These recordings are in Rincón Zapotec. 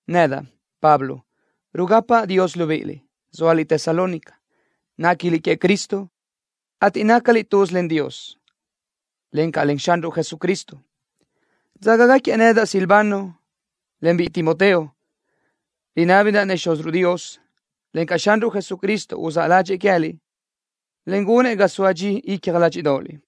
Nedaʼ, Pablo, rugapaʼ Dios libíʼiliʼ, zóaliʼ Tesalónica. Néquiliʼ queëʼ Cristo, ateʼ nácaliʼ tuz len Dios, encaʼ len Xanruʼ Jesucristo. Dzágagaquiëʼ nedaʼ Silvano, en biʼi Timoteo. Rinábidaʼ-nëʼ Xúziruʼ Dios, encaʼ Xanruʼ Jesucristo uzáʼ ládxëʼë queë́liʼ, en gunëʼ ga soa dxi icja ládxiʼdoʼoliʼ.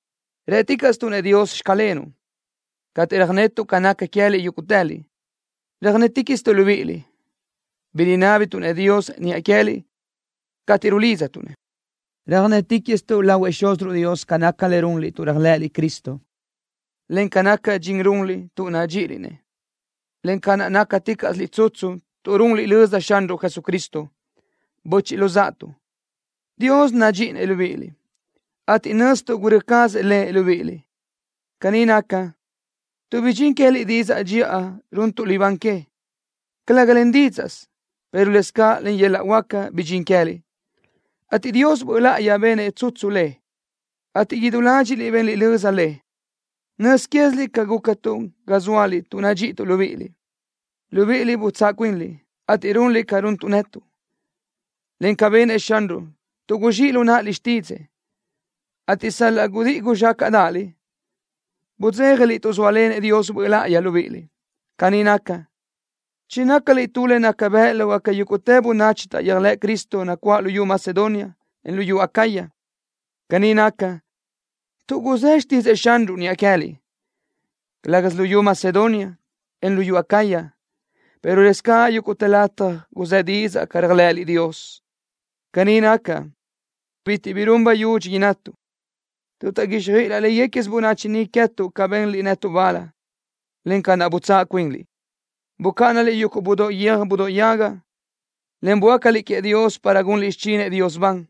Rë́ticaʼstuʼ-nëʼ Dios: “Xclenuʼ” cateʼ röjnetuʼ ca naca queë́liʼ yúguʼtëliʼ. Röjnéticaʼstuʼ libíʼiliʼ, bi rinábituʼ-nëʼ Dios niʼa queë́liʼ cateʼ rulidztuʼ-nëʼ. Röjnéticaʼstuʼ lahuëʼ Xúziruʼ Dios ca naca le runliʼ tuʼ réajlëʼëliʼ Cristo, en ca naca dxin runliʼ tuʼ nadxíʼiliʼ-nëʼ, en ca naʼ nácaticaʼsiliʼ tsutsu tuʼ runliʼ löza Xanruʼ Jesucristo. Böchiʼ luzáʼatuʼ, Dios nadxíʼinëʼ libíʼiliʼ, ateʼ nöztuʼ gurö́ cazëʼ Lëʼ libíʼiliʼ. Caní naca, tuʼ bidxín queë́liʼ didzaʼ dxiʼa runtuʼ libán que, calëga len dídzaʼsö, pero lëscaʼ len yöl-laʼ huáca bidxín queë́liʼ, ateʼ Dios Böʼ Láʼayi benëʼ tsutsu le, ateʼ idú ládxiʼliʼ benliʼ löza le. Nöz quéziliʼ ca gúcatuʼ ga zóaliʼ tuʼ nadxíʼituʼ libíʼiliʼ. Libíʼiliʼ butsáʼ cuinliʼ, ateʼ runliʼ ca runtuʼ netuʼ, encaʼ ca benëʼ Xanruʼ, tuʼ guzxíʼ lu náʼaliʼ xtídzëʼë, ateʼ sal-laʼ gudíʼi guzxácaʼdaʼaliʼ, budzéjaliʼ tuʼ zóalenëʼ Dios Böʼ Láʼayi libíʼiliʼ. Caní naca, chinácaliʼ tu le naca bëʼ lógaca yúguʼtë bönachi taʼyéajlëʼ Cristo nacuáʼ luyú Macedonia, en luyú Acaya. Caní naca, tuʼ guzë́ xtídzëʼë Xanruʼ niʼa queë́liʼ. Calë́gasö luyú Macedonia, en luyú Acaya, pero lëscaʼ yúguʼtë lataj guzë́ didzaʼ ca réajlëʼëliʼ Dios. Caní naca, bitiʼ bi run bayudxi innatuʼ, tuʼ taʼguixjöʼ laʼ léguequisö bönachi niʼ queë́tuʼ ca benliʼ netuʼ bal, en ca naʼ butsáʼ cuinliʼ. Bucáʼanaliʼ yuguʼ budóʼ guiö́j budóʼ yaga, en böácaliʼ queëʼ Dios para gunliʼ xichinëʼ Dios ban,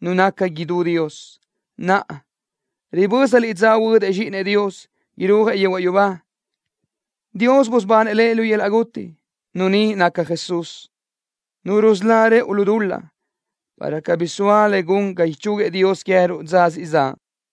Nu naca idú Dios. Naʼa, ribö́zaliʼ dza huödëʼ Zxíʼinëʼ Dios, irúajëʼ yehuaʼ yubá. Dios busubanëʼ Lëʼ lu yöl-laʼ guti. Nu ni naca Jesús, Nu rusölá rëʼu lu dul-laʼ, para cabí soa le gun ga ichúguiëʼ Dios queë́ruʼ dza siʼ zaʼ.